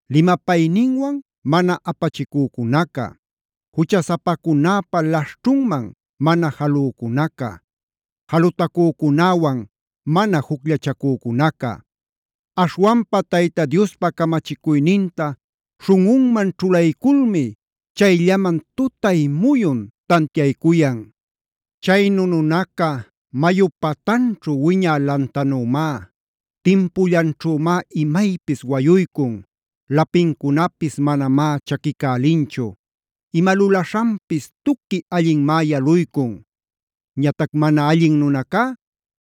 limapayninwan mana apachicücunaca, juchasapacunäpa laśhćhunman mana jalücunaca, jalutacücunäwan mana jucllachacücunaca. Aśhwanpa Tayta Diospa camachicuyninta śhunꞌunman ćhulayculmi chayllaman tutay muyun tantiaycuyan. Chaynu nunaca mayup patanćhu wiñä lantanümá.a Timpullanćhümá imaypis wayuycun. Lapincunapis manamá chaquicälinchu. Ima lulaśhanpis tuqui allinmá yaluycun. Ñatac mana allin nunacunacá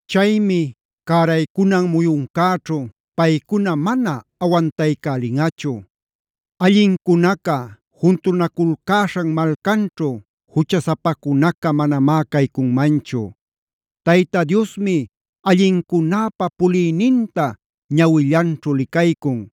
Chaymi cäraycunan muyuncäćhu paycuna mana awantaycälinꞌachu. Allincunaca juntunaculcäśhan malcanćhu juchasapacunaca manamá caycunmanchu. Tayta Diosmi allincunäpa puliyninta ñawillanćhu licaycun.